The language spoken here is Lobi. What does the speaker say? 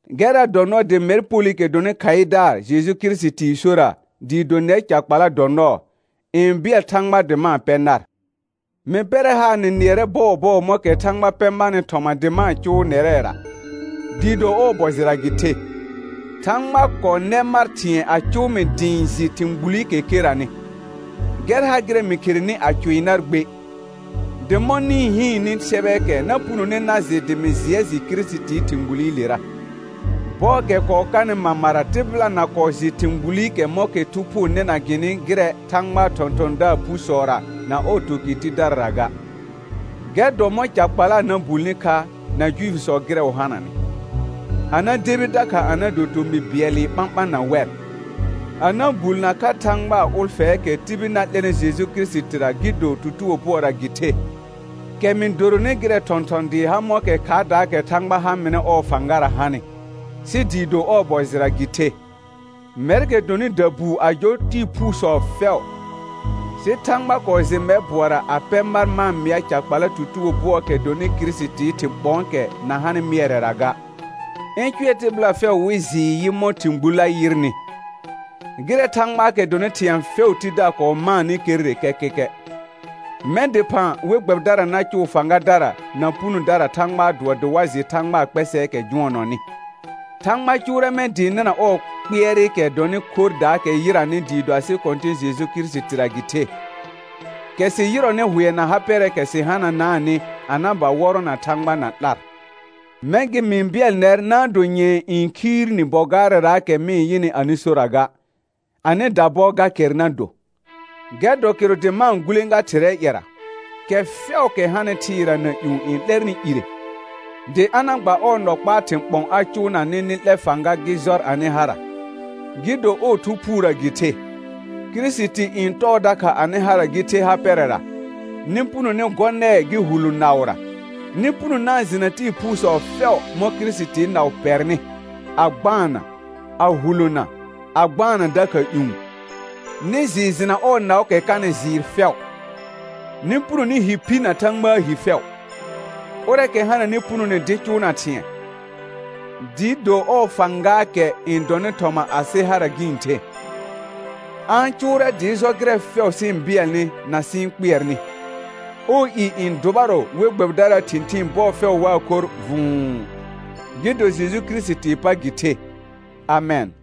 Gɛrra dɔ nɔɔ dɩ mɛr Polɩkɛ dɔnɩ khaɩdaar Jeju Kirisitii sora dɩɩ do nɛr ca kpala dɔ nɔɔ, n bɩɛl Thãgba dɩ ma-n pɛ nar. Mɩ pɛrɛ haar nɩ nɩɛrɛ bɔɔbɔɔ mɔ̃kɛ Thãgba pɛ marnɩ thɔma dɩ ma-n cʋʋ nɛrɛra, dɩɩ do ɔɔ bɔ jɩra gɩ the. Thãgba kɔɔ nɛ mar thɩ̃ɛ a cʋʋ mɩ dɩ ɩ̃ jɩ thɩ̃ gbulikɛ keranɩ, gɛr ha gɩrɛ mɩ kherenɩ a cʋɩ nar gbe; dɩ mɔ̃ nɩ-n hɩɩnnɩ sɛbɛɛkɛ na punone na jɩ dɩ mɩ jɩɛ jɩ Kirisitii thɩ̃ gbulilera. Bɔɔkɛ kɔɔ kanɩ mamara tɩbɩla na kɔɔ jɩ thɩ̃ gbulikɛ mɔ̃kɛ Thu Phuu nɩna gɩnɩ gɩrɛ Thãgbaa thɔ̃thɔ̃daar phusɔra na ɔɔ tukɩr tidarara ga. Gɛr dɔ mɔ̃ ca kpala na bulni kha na Juifisɔ gɩrɛ wɩ hananɩ, a na debi dakha a na do tomɩ bɩɛlɩ ɓãɓã na wɛr, a na bulnə kha Thãgbaa ʋlfɛɛkɛ tibil na 'lɛnɩ Jeju Kirisitira gɩ do tutugo bʋɔra gɩ the, kɛ mɩ doronɩ gɩrɛ thɔ̃thɔn dɩɩ ha mɔ̃kɛ khaardaakɛ Thãgba ha mɩnɩ ɔɔ fãgara hanɩ, sɩ dɩɩ do ɔɔ bɔ jɩra gɩ the. Mɛrkɛ dɔnɩ dabuu a jɔ tɩɩ phuusɔ fɛʋ, sɩ Thãgba kɔɔ jɩ mɛr bʋɔra a pɛ mar ma-n mɩa ca kpala tutugo bʋɔɔkɛ dɔnɩ Kirisitii thɩ̃ ɓɔ̃ɔkɛ na hanɩ mɩɛrɛra ga, ɩ̃ cʋɛ tɩbɩla fɛʋ wɩ jɩɩ yɩ mɔ̃ thɩ̃ gbullə yɩrnɩ, gɩrɛ Thãgbaakɛ dɔnɩ thɩ̃ɛ fɛʋʋ Tidaar kɔɔ maanɩ kerre kɛkɛkɛ. Mɛ̃ dɩphã we gbɛbɩdara na cʋʋ fãgadara na punodara Thãgbaa dʋɔ dɩ wa jɩ Thãgbaa kpɛsɛɛkɛ jʋɔnɔnɩ. Thãgba cʋʋrɛ mɛ̃ dɩɩ nɩna ɔɔ kpɩɛrɩkɛ dɔnɩ khorrdaakɛ yɩranɩ dɩɩ do asɩ Kɔ̃tɩ̃ Jeju Kirisitira gɩ the, kɛ sɩ yɩrɔnɩ hʋɛ na ha pɛrɛɛkɛ sɩ hananaanɩ a na ba wɔrɔna Thãgba na 'lar. Mɛ̃ gɩ mɩ-n bɩɛl nɛr na-n do nyɛ̃ɛ n khiir ni bɔ gaarɛraakɛ mɩ-n yɩnɩ anɩ sora ga, anɩ dabɔ ga kɛr na do. Gɛr dɔ kɩrʋ dɩ ma-n gulẽga Thɩrɛɛ ƴɛra, kɛ fɛʋʋkɛ hanɩ thɩɩra na ƴũ n 'lɛrnɩ ire, dɩ a na gba ɔɔ nɔ kpaa thɩ̃ ɓɔ̃ a cʋʋna nɩ nɩ 'lɛ fãga gɩ jɔr anɩ hara, gɩ do ɔɔ Thu Phuurə gɩ the; Kirisiti n tɔɔ dakha anɩ hara gɩ the ha pɛrɛra, nɩ puno nɩ gɔ nɛɛ gɩ hulõ naʋra; nɩ puno na-n jɩ na tɩɩ phuusɔ fɛʋ mɔ̃ Kirisitii naʋ pɛrnɩ, a gbaanna, a hulona, a gbaanna dakha ƴũ; nɩ jɩɩ jɩna ɔɔ naʋʋkɛ kanɩ jɩɩr fɛʋ, nɩ puno nɩ hi phi na Thãgbaa hi fɛʋ. Ʋrɛɛkɛ hananɩ punone dɩ cʋʋna thɩ̃ɛ, dɩɩ do ɔɔ fãgaakɛ n dɔnɩ thɔma asɩ hara gɩ-n the, a-n cʋʋrɛ dɩɩ jɔ gɩrɛ fɛʋ sɩ-n bɩɛlnɩ na sɩ-n kpɩɛrnɩ; ɔɔ i n dʋbarɔ we gbɛbɩdaraa thɩ̃thɩɩn bɔɔ fɛʋ waa khorr vʋ̃ʋ, gɩ do Jeju Kirisitii pa gɩ the. Amɛn.